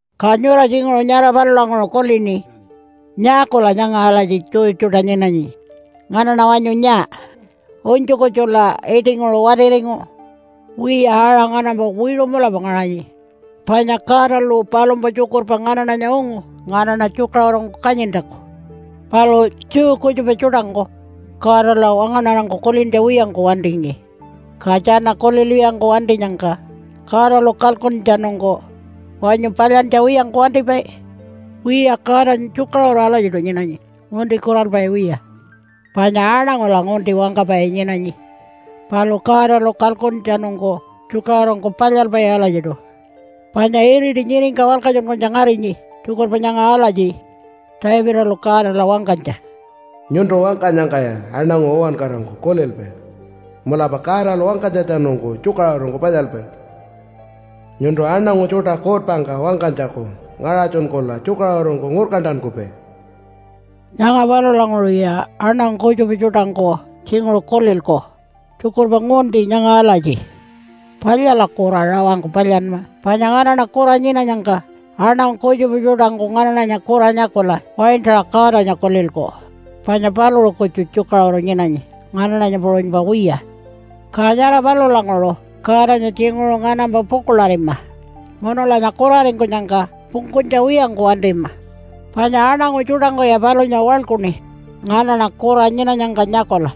Ka nyura tjinguṟu nyara palulanguṟu kulini, “Nyaakula nyanga alatji Jew tjuṯa nyinanyi? Nganaṉa wanyu nyaa? Unytju kutjula iṯinguṟu watiringu?” Wiya, aṟa nganampa wiṟu mulapa ngaṟanyi. Panya Godalu palumpa tjukurpa nganaṉanya ungu nganaṉa tjukaṟurungku kanyintjaku. Palu Jew kutjupa tjuṯangku Godala wangaṉarangku kulintja wiyangku wantingi. Ka tjana kulilwiyangku wantinyangka Godalu kalkuntjatjanungku wanyu palyantja wiyangku wantipai? Wiya, Godanya tjukaṟuru alatjiṯu nyinanyi, ngunti kuralpai wiya. Panya aṉangula ngunti wangkapai nyinanyi, palu Godalu kalkuntjatjanungku tjukaṟurungku palyalpai alatjiṯu. Panya iriti nyiringka walkatjunkunytja ngarinyi tjukurpa nyanga alatji Davidalu Godala wangkanytja, “Nyuntu wangkanyangkaya aṉangu uwankarangku kulilpai, ‘Mulapa Godalu wangkanytjatjanungku tjukaṟurungku palyalpai.’ Nyuntu aṉangu tjuṯa kuutpangka wangkanytjaku ngaṟatjunkula tjukaṟurungku ngurkantankupai.” Nyanga palulanguṟuya aṉangu kutjupa tjuṯangku tjinguṟu kulilku tjukurpa ngunti nyanga alatji, “Palyala kura rawangku palyanma. Panya nganaṉa kura nyinanyangka aṉangu kutjupa tjuṯangku nganaṉanya kura nyakula waintaṟa Godanya kulilku panya paluṟu kutju tjukaṟuru nyinanyi nganaṉanya puṟunypa wiya. Ka nyara palulanguṟu Godanya tjinguṟu nganampa pukuḻarima munulanya kuraringkunyangka pungkunytja wiyangku wantima, panya aṉangu tjuṯangkuya palunya waḻkuṉi nganaṉa kura nyinanyangka nyakula.”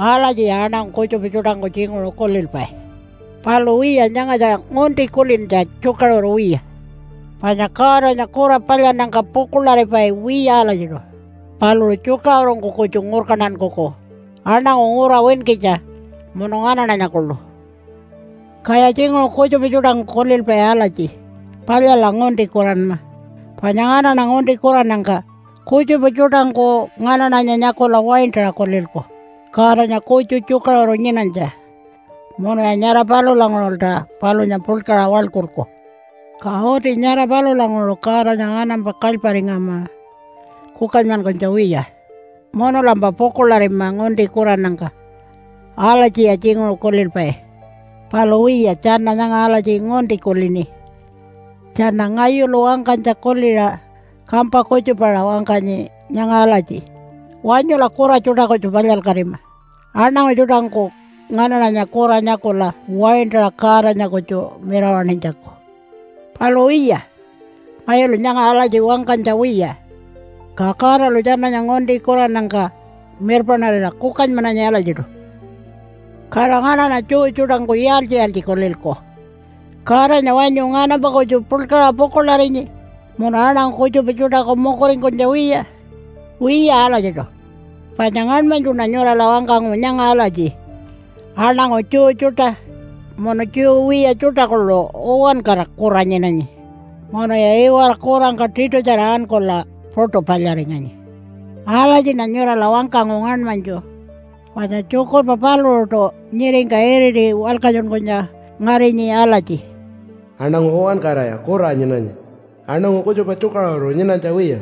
Alatjiya aṉangu kutjupa tjuṯangku tjinguṟu kulilpai. Palu wiya, nyangatja ngunti kulintja tjukaṟuru wiya. Panya Godanya kura palyannyangka pukuḻaripai wiya alatjiṯu. Paluṟu tjukaṟurungku kutju ngurkantankuku aṉangu ngura winkitja, munu nganaṉanya kuḻu. Kaya tjinguṟu kutjupa tjuṯangku kulilpai alatji, “Palyala ngunti kuranma, panya nganaṉa ngunti kurannyangka kutjupa tjuṯangku nganaṉanya nyakula waintaṟa kulilku Godanya kutju tjukaṟuru nyinanytja, munuya nyara palulanguṟulta palunya puḻkaṟa waḻkulku. Ka uti nyara palulanguṟu Godanya nganampa kalyparingama kukanymankunytja wiya, munulampa pukuḻarima ngunti kurannyangka.” Alatjiya tjinguṟu kulilpai. Palu wiya, tjana nyanga alatji ngunti kulini. Tjana ngayulu wangkanytja kuliṟa kampa kutjupaṟa wangkanyi nyanga alatji, “Wanyula kura tjuṯa kutju palyalkatima aṉangu tjuṯangku nganaṉanya kura nyakula waintaṟa Godanya kutju mirawaṉinytjaku.” Palu wiya, ngayulu nyanga alatji wangkanytja wiya. Ka Godalu tjananya ngunti kurannyangka mirpaṉarira kukanymananyi alatjiṯu. Kala nganaṉa Jew tjuṯangku yaaltji-yaaltji kulilku? Godanya wanyu nganampa kutju puḻkaṟa pukuḻarinyi munu aṉangu kutjupa tjuṯaku mukuringkunytja wiya? Wiya alatjiṯu. Panya ngaṉmanytjuṉa nyurala wangkangu nyanga alatji, “Aṉangu Jew tjuṯa munu Jew wiya tjuṯa kuḻu uwankara kura nyinanyi, munuya iwara kurangka tiṯutjara ankula puṯu palyaringanyi.” Alatjiṉa nyurala wangkangu ngaṉmanytju, panya tjukurpa paluṟuṯu nyiringka iriti walkatjunkunytja ngarinyi alatji, “Aṉangu uwankaraya kura nyinanyi, aṉangu kutjupa tjukaṟuru nyinanytja wiya.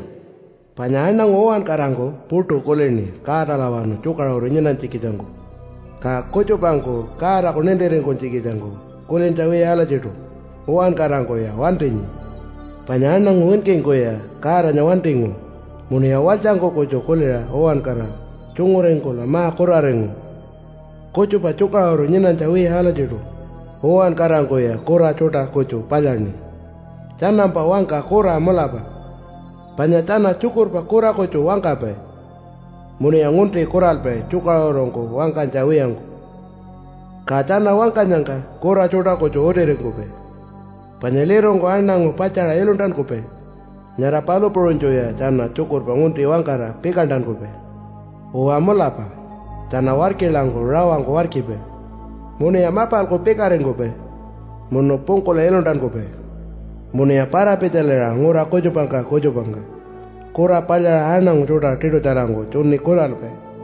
Panya aṉangu uwankarangku puṯu kulini Godalawanu tjukaṟuru nyinanytjikitjangku. Ka kutjupangku Godaku nintiringkunytjikitjangku kulintja wiya alatjiṯu, uwankarangkuya wantinyi. Panya aṉangu winkingkuya Godanya wantingu, munuya walytjangku kutju kuliṟa uwankara tjunguringkula ma-kuraringu. Kutjupa tjukaṟuru nyinanytja wiya alatjiṯu, uwankarangkuya kura tjuṯa kutju palyaṉi. Tjanampa wangka kura mulapa, panya tjana tjukurpa kura kutju wangkapai, munuya ngunti kuralpai tjukaṟurungku wangkanytja wiyangku. Ka tjana wangkanyangka kura tjuṯa kutju utiringkupai. Panya lirungku aṉangu patjaṟa iluntankupai, nyara palu puṟunytjuya tjana tjukurpa ngunti wangkara pikantankupai. Uwa mulapa, tjana warkilangku rawangku warkipai. Munuya mapalku pikaringkupai munu pungkula iluntankupai. Munuya para-pitjaliṟa ngura kutjupangka kutjupangka kura palyaṟa aṉangu tjuṯa tiṯutjarangku tjuni kuralpai.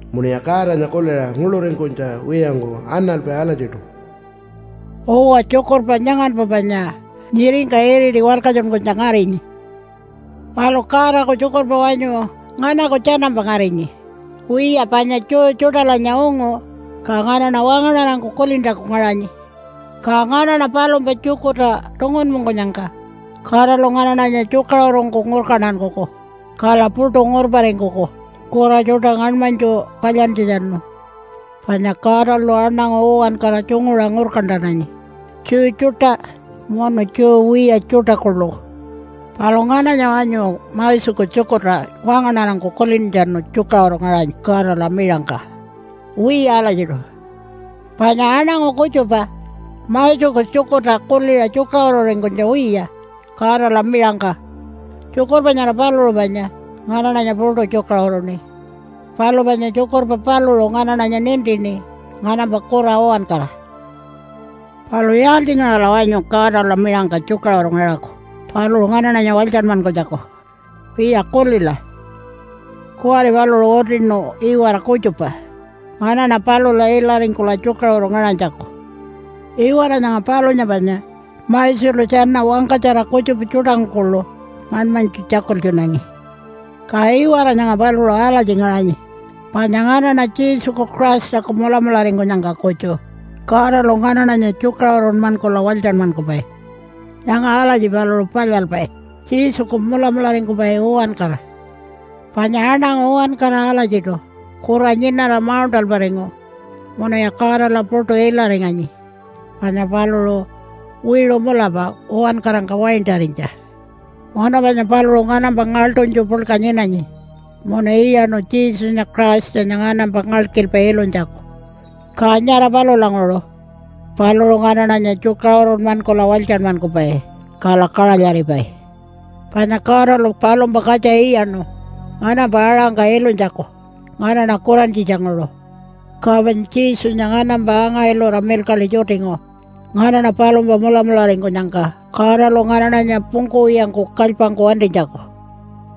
Munuya Godanya kuliṟa nguḻuringkunytja wiyangku analpai alatjiṯu.” Uwa, tjukurpa nyanganpa panya nyiringka iriti walkatjunkunytja ngarinyi. Palu Godaku tjukurpa wanyu nganaku tjanampa ngarinyi? Wiya, panya Jew tjuṯalanya ungu, ka nganaṉa wangaṉarangku kulintjaku ngaṟanyi. Ka nganaṉa palumpa tjukurta tungunpungkunyangka Godalu nganaṉanya tjukaṟurungku ngurkantankuku, kala puṯu ngurparingkuku kura tjuṯa ngaṉmanytju palyantjatjanu. Panya Godalu aṉangu uwankara tjunguṟa ngurkantananyi Jew tjuṯa munu Jew wiya tjuṯa kuḻu. Palu ngananya wanyu Moseku tjukurta wangaṉarangku kulintjatjanu tjukaṟuru ngaṟanyi Godala miṟangka? Wiya alatjiṯu, panya aṉangu kutjupa Moseku tjukurta kuliṟa tjukaṟururingkunytja wiya Godala miṟangka. Tjukurpa nyara paluṟu panya nganaṉanya puṯu tjukaṟuruṉi, palu panya tjukurpa paluṟu nganaṉanya nintini nganampa kura uwankara. Palu yaaltjingaṟala wanyu Godala miṟangka tjukaṟuru ngaṟaku paluṟu nganaṉanya walytjanmankunytjaku? Wiya kulila, kuwari paluṟu utinu iwara kutjupa nganaṉa palula ilaringkula tjukaṟuru ngaṟanytjaku. Iwara nyanga palunya panya Moselu tjana wangkatjara kutjupa tjuṯangku kuḻu ngaṉmanytju tjakultjunangi. Ka iwara nyanga paluṟu alatji ngaṟanyi panya nganaṉa Jesuku Christaku mulamularingkunyangka kutju Godalu nganaṉanya tjukaṟurunmankula walytjanmankupai. Nyanga alatji paluṟu palyalpai Jesuku mulamularingkupai uwankara, panya aṉangu uwankara alatjiṯu kura nyinara mauṉṯalparingu munuya Godala puṯu ilaringanyi panya paluṟu wiṟu mulapa uwankarangka waintarinytja. Munu panya paluṟu nganampa ngaḻṯunytju puḻka nyinanyi, munu iyaṉu Jesunya Christanya nganampa ngalkilpa ilunytjaku, ka nyara palulanguṟu paluṟu nganaṉanya tjukaṟurunmankula walytjanmankupai kala kaṟalyaripai. Panya Godalu palumpa katja iyaṉu nganampa aṟangka ilunytjaku nganaṉa kurantjitjanguṟu. Ka panya Jesunya nganampa anga-ilura milkaḻi tjutingu nganaṉa palumpa mulamularingkunyangka Godalu nganaṉanya pungkuwiyangku kalypangku wantinytjaku.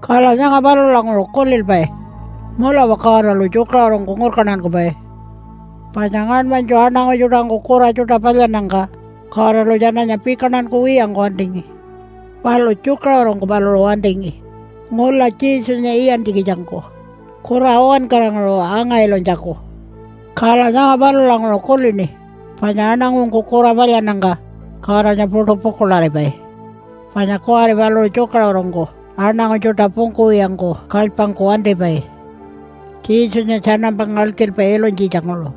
Kala nyanga palulanguṟu kulilpai mulapa Godalu tjukaṟurungku ngurkantankupai. Panya ngaṉmanytju aṉangu tjuṯangku kura tjuṯa palyannyangka Godalu tjananya pikantankuwiyangku wantingi. Palu tjukaṟurungku paluṟu wantingi ngula Jesunya iyantjikitjangku kura uwankaranguṟu anga-ilunytjaku. Kala nyanga palulanguṟu kulini panya aṉangungku kura palyannyangka Godanya puṯu pukuḻaripai, panya kuwari paluṟu tjukaṟurungku aṉangu tjuṯa pungkuwiyangku kalypangku wantipai Jesunya tjanampa ngalkilpa ilunytjitjanguṟu,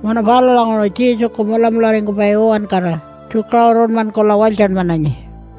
munu palulanguṟu Jesuku mulamularingkupai uwankara tjukaṟurunmankula walytjanmananyi.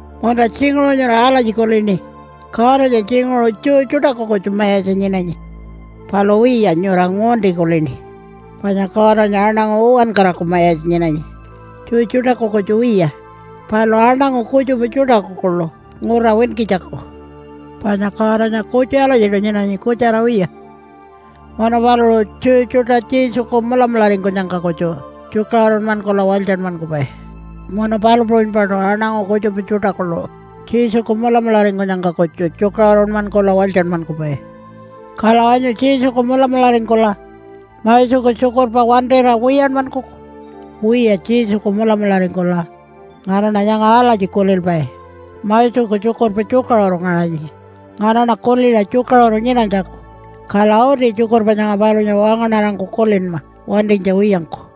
Munta tjinguṟu nyura alatji kulini, “Godanya tjinguṟu Jew tjuṯaku kutju mayatja nyinanyi.” Palu wiya, nyura ngunti kulini, panya Godanya aṉangu uwankaraku mayatja nyinanyi, Jew tjuṯaku kutju wiya, palu aṉangu kutjupa tjuṯaku kuḻu ngura winkitjaku. Panya Godanya kutju alatjiṯu nyinanyi kutjara wiya. Munu paluṟu Jew tjuṯa Jesuku mulamularingkunyangka kutju tjukaṟurunmankula walytjanmankupai, munu palu puṟunypaṯu aṉangu kutjupa tjuṯa kuḻu Jesuku mulamularingkunyangka kutju tjukaṟurunmankula walytjanmankupai. Kala wanyu Jesuku mulamularingkula Moseku tjukurpa wantira wiyanmankuku? Wiya, Jesuku mulamularingkula nganaṉa nyanga alatji kulilpai, “Moseku tjukurpa tjukaṟuru ngaṟanyi nganaṉa kuliṟa tjukaṟuru nyinanytjaku, kala uti tjukurpa nyanga palunya wangaṉarangku kulinma wantinytja wiyangku.”